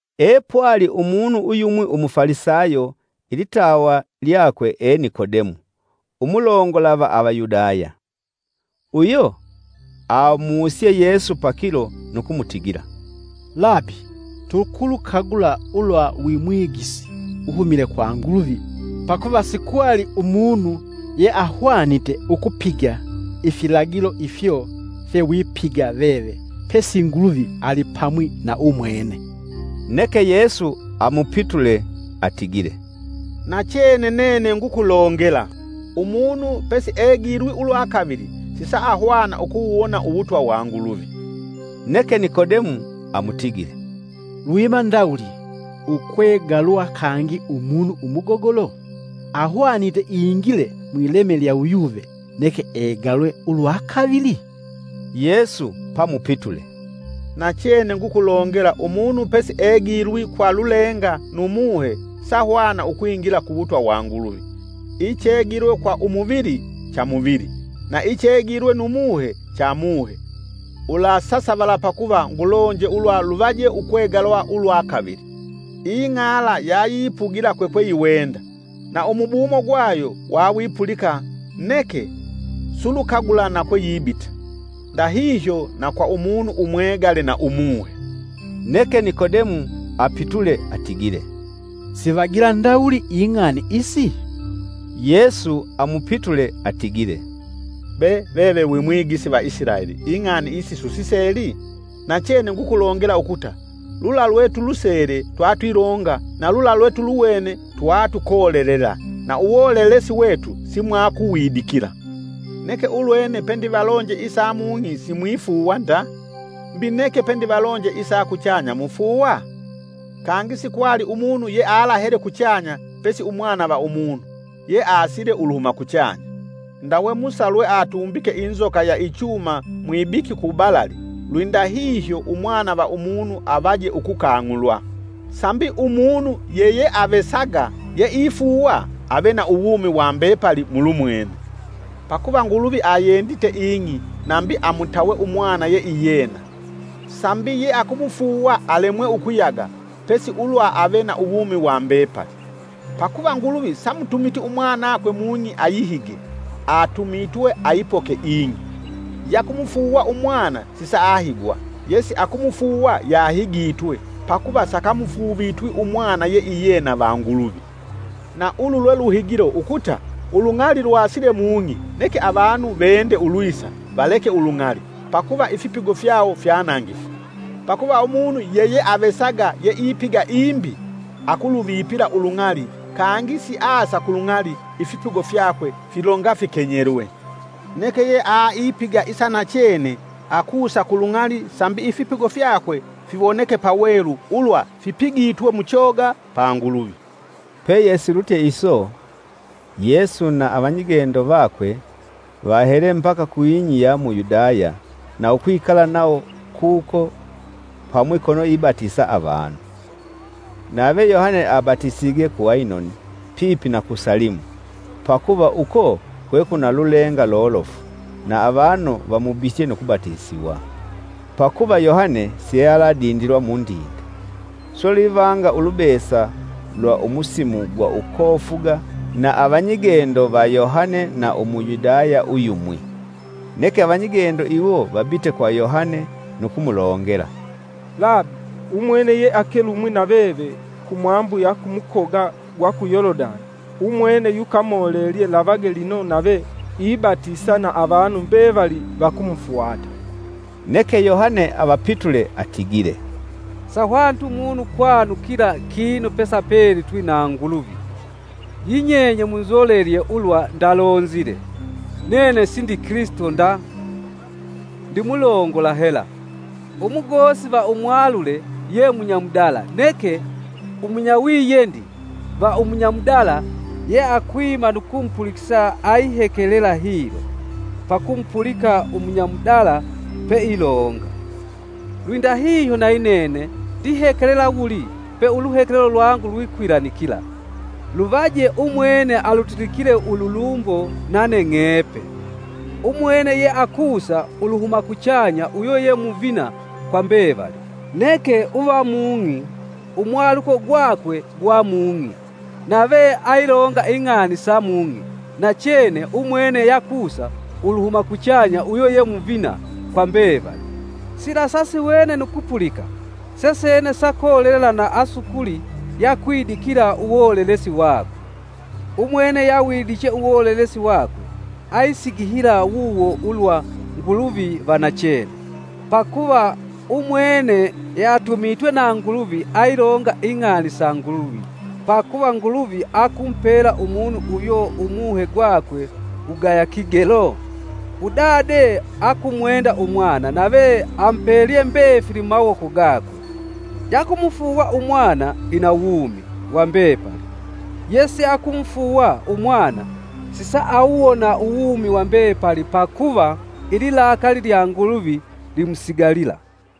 Epwali umunu uyumwi umufalisayo ilitawa lyakwe e Nikodemu umulongola va Avayudaya. Uyo amusye Yesu pakilo nu kumutigila, “Labi tukulukagula ulwa wi mwigisi uhumile kwa Nguluvi. Pakuva sikwali umunu yeahwanite ukupiga ifilagilo ifyo fyewipiga veve pesi Nguluvi alipamwi na Umwene.” Neke Yesu amupitule atigile, “Nachene nene ngukulongela: umunu pesiegilwi ulwa kavili sisauhanga ukuwuwona uwutwa wa Nguluvi.” “Neke Nikodemu amutigile lwiima ndawuli ukwegalwa kangi umunu umugogolo? Ahwanite ingile mwileme lya uyuve neke egalwe ulwa kavili?” Yesu pamupitule, “Nachene ngukulongela umunu pesiegilwi kwa lulenga nu Muhe sahwana ukwingila kuwutwa wa Nguluvi. Ichegilwe kwa umuvili, cha muvili, na ichegilwe nu Muhe, cha Muhe. Ulasasavala pakuva ngulonje ulwa luvaje ukwegalwa ulwa kavili. Ing'ala yayipugila kwekweyiwenda; na umubumo gwayo wawipulika neke sulukagula na kwe yibita. Ndahihyo na kwa munu umwegale nu Umuhe.” Neke Nikodemu apitule atigile, “Sivagila ndawuli ing'ani isi?” Yesu amupitule atigile, “Be veve wi Mwigisi va Isilaeli ing'ani isi susiseli? Nachene ngukulongela ukuta lula lwetulusele twatwilonga na lula lwetuluwene twatukolelela na uwolelesi wetu simwakuwidikila. Neke ulwene pendivalonje isa mung'i simwifuuwa nda, mbi neke pendivalonje isa kuchanya mufuuwa? Kangi sikwali umunu yealahele kuchanya pesi Umwana va Umunu, yeasile uluhuma kuchanya. “Ndawe Musa lwe atumbike inzoka ya ichuma mwibiki ku balali, lwindahihyo Umwana va Umunu avaje ukukang'ulwa, sambi umunu yeyeavesaga yeifuuwa ave na uwumi wa mbepali mulumwene. Pakuva Nguluvi ayiyendite ing'i nambi amutawe Umwana yeiyena, sambi yeakumufuuwa alemwe ukuyaga pesi ulwa ave na uwumi wa mbepali. Pakuva Nguluvi samutumiti Umwanakwe mung'i ayihige; atumitwe aipoke ing'i. “Yakumufuuwa umwana sisaahigwa yesiakumufuuwa yahigitwe pakuva sakamufuuvitwi Umwana yeiyena va Nguluvi. Na ulu lwe luhigilo ukuta ulung'ali lwasile mung'i neke avanu vende ulwisa valeke ulung'ali pakuva ifipigo fyawo fyanangifu. Pakuva Umunu yeyeavesaga yeipiga imbi akuluvipila ulung'ali kangi siasa ku lung'ali ifipigo fyakwe filonga fikenyelwe. Neke yeaipiga isa nachene akusa ku lung'ali sambi ifipigo fyakwe fiwoneke pawelu ulwa fipigitwe muchoga pa Nguluvi.” Peye silutye iso, Yesu na avanyigendo vakwe, vahele mbaka ku ing'i ya mu Yudaya na ukwikala nawo kuko pamwi kono ibatisa avanu. Nave Yohane abatisige ku Ainoni, pipi na ku Salimu, pakuva uko kwekwina lulenga lolofu na avanu vamubitye nu kubatisiwa. ( Pakuva Yohane siealadindilwa mundinde.) Swe lwivanga ulubesa lwa musimu gwa ukofuga na avanyigendo va Yohane na Umuyudaya uyumwi. Neke avanyigendo iwo vabite kwa Yohane nu kumulongela, “Labi, umwene yeakelumwi na veve kumwambu ya ku kumukoga gwa ku Yolodani, umwene yukamolelelye lavage lino nave ibatisa na avanu mbevali vakumufwata!” Neke Yohane avapitule atigile, “Sahwaniti munu ukwanukila kinu pesiapelitwi na Nguluvi.” Yinyenye munzolelye ulwa ndalonzile, “Nene sindi Kilisito nda, ndimulongola hela!” Umugosi va umwalule ye munyamudala neke umunyawiyendi va umunya mudala yeakwima nu kumupulikisa ayihekelela hilo pakumupulika umunya mudala peilonga. Lwindahiyo nayinene ndihekelela wuli pe uluhekelelo lwangu lwikwilanikila. Luvaje umwene alutilikile ululumbo, nane ng'epe. “Umwene yeakusa uluhuma kuchanya uyo ye muvina kwa mbevali umwene uva mung'i umwaluko gwakwe gwa mung'i, nave ayilonga ing'ani sa mung'i nachene umwene yakusa uluhuma kuchanya uyo ye muvina kwa mbevali. Sila sasiwene nu kupulika sesene seakolelela na asukuli yeakwidikila uwolelesi wakwe. Umwene yawidiche uwolelesi wakwe ayisigihila wuwo ulwa Nguluvi va nachene. Pakuva umwene yeatumitwe na Nguluvi ailonga ing'ani sa Nguluvi pakuva Nguluvi akumupela umunu uyo Umuhe gwakwe wugaya kigelo? Udade akumwenda Umwana nave amupelye mbefili mumawoko gakwe. Yakumufuuwa umwana ina uwumi wa mbepali, yesiakumufuuwa Umwana sisaahanga uwumi wa mbepali pakuva ililakali lya Nguluvi limusigalila.”